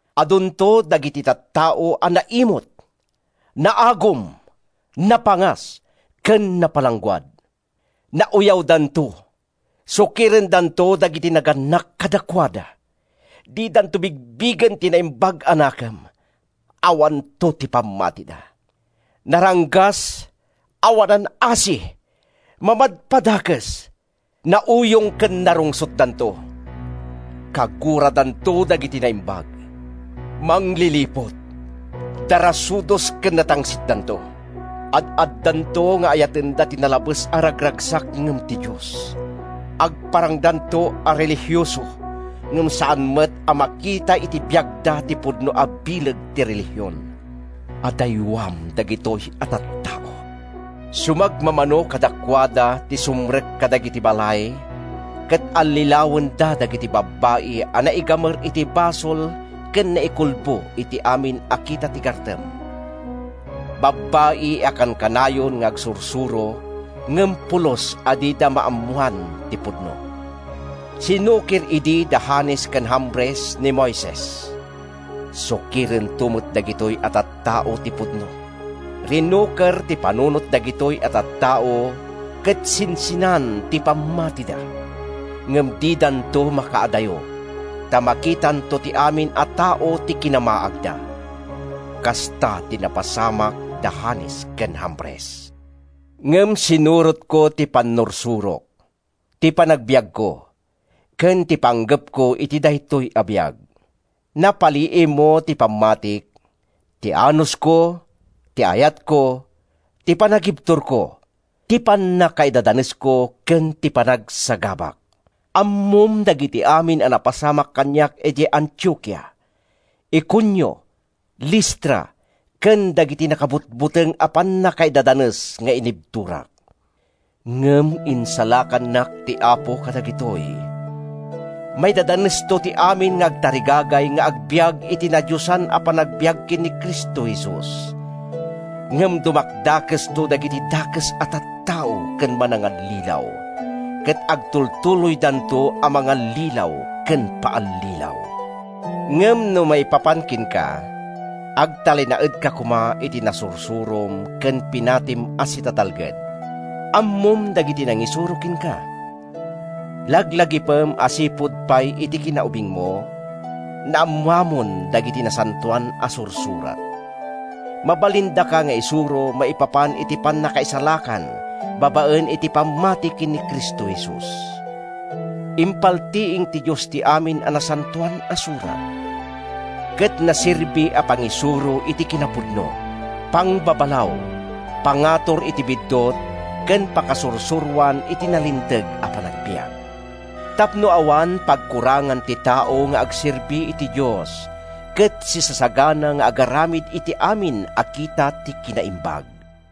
Adunto dagiti tattao a naimut, naagum, napangas, ken napalangguad. Nauyawdanto, sukirendanto dagiti nagannak kadakuada, didanto bigbigen ti naimbag a nakem, awanto ti pammatida. Naranggas, awanan asi, mamadpadakes, nauyong ken narungsotdanto, kaguradanto dagiti naimbag. Mangliliput, darasudos ken natangsitdanto. Ad-addanto nga ayatenda ti nalabes a ragragsak ngem ti Dios. Agparangdanto a relihioso ngem saan met a makita iti biagda ti pudno a bileg ti relihion. Adaywam dagitoy a tattao. Sumagmamano kadakuada ti sumrek kadagiti balay ket allilawenda dagiti babbai a naigamer iti basol ken naikulbo iti amin a kita ti gartem, babbai a kankanayon nga agsursuro ngem pulos a dida maammoan ti pudno. Sinukir idi da Janes ken Jambres ni Moises. Sukirento met dagitoy a tattao ti pudno. Rinuker ti panunot dagitoy a tattao ket sinsinan ti pammatida. Ngem didanto makaadayo, ta makitanto ti amin a tao ti kinamaagda. Kasta ti napasamak da Janes ken Jambres. Ngem sinurotmo ti pannursurok, ti panagbiagko, ken ti panggepko iti daytoy a biag. Napaliiwmo ti pammatik, ti anusko, ti ayatko, ti panagibturko, ti pannakaidadanesko ken ti panagsagabak. Ammom dagiti amin a napasamak kaniak idiay Antiokia, Iconio, Listra, ken dagiti nakabutbuteng a pannakaidadanes nga inibturak. Ngem insalakannak ti Apo kadagitoy! Maidadanesto ti amin nga agtarigagay nga agbiag iti nadiosan a panagbiag ken ni Cristo Jesus. Ngem dumakdakesto dagiti dakes a tattao ken manangallilaw, ket agtultuloydanto a mangallilaw ken paallilaw. Ngem no maipapan kenka, agtalinaedka koma iti nasursurom ken pinatim a sitatalged. Ammom dagiti nangisuro kenka. Laglagipem a sipud pay iti kinaubingmo, naammoamon dagiti Nasantoan a Sursurat. Mabalindaka nga isuro maipapan iti pannakaisalakan babaen iti pammati ken ni Cristo Jesus. Impaltiing ti Dios ti amin a Nasantoan a Surat, ket naserbi a pangisuro iti kinapudno, pangbabalaw, pangatur iti biddut ken pakasursuroan iti nalinteg a panagbiag, tapno awan pagkurangan ti tao nga agserbi iti Dios, ket sisasagana nga agaramid iti amin a kita ti kinaimbag.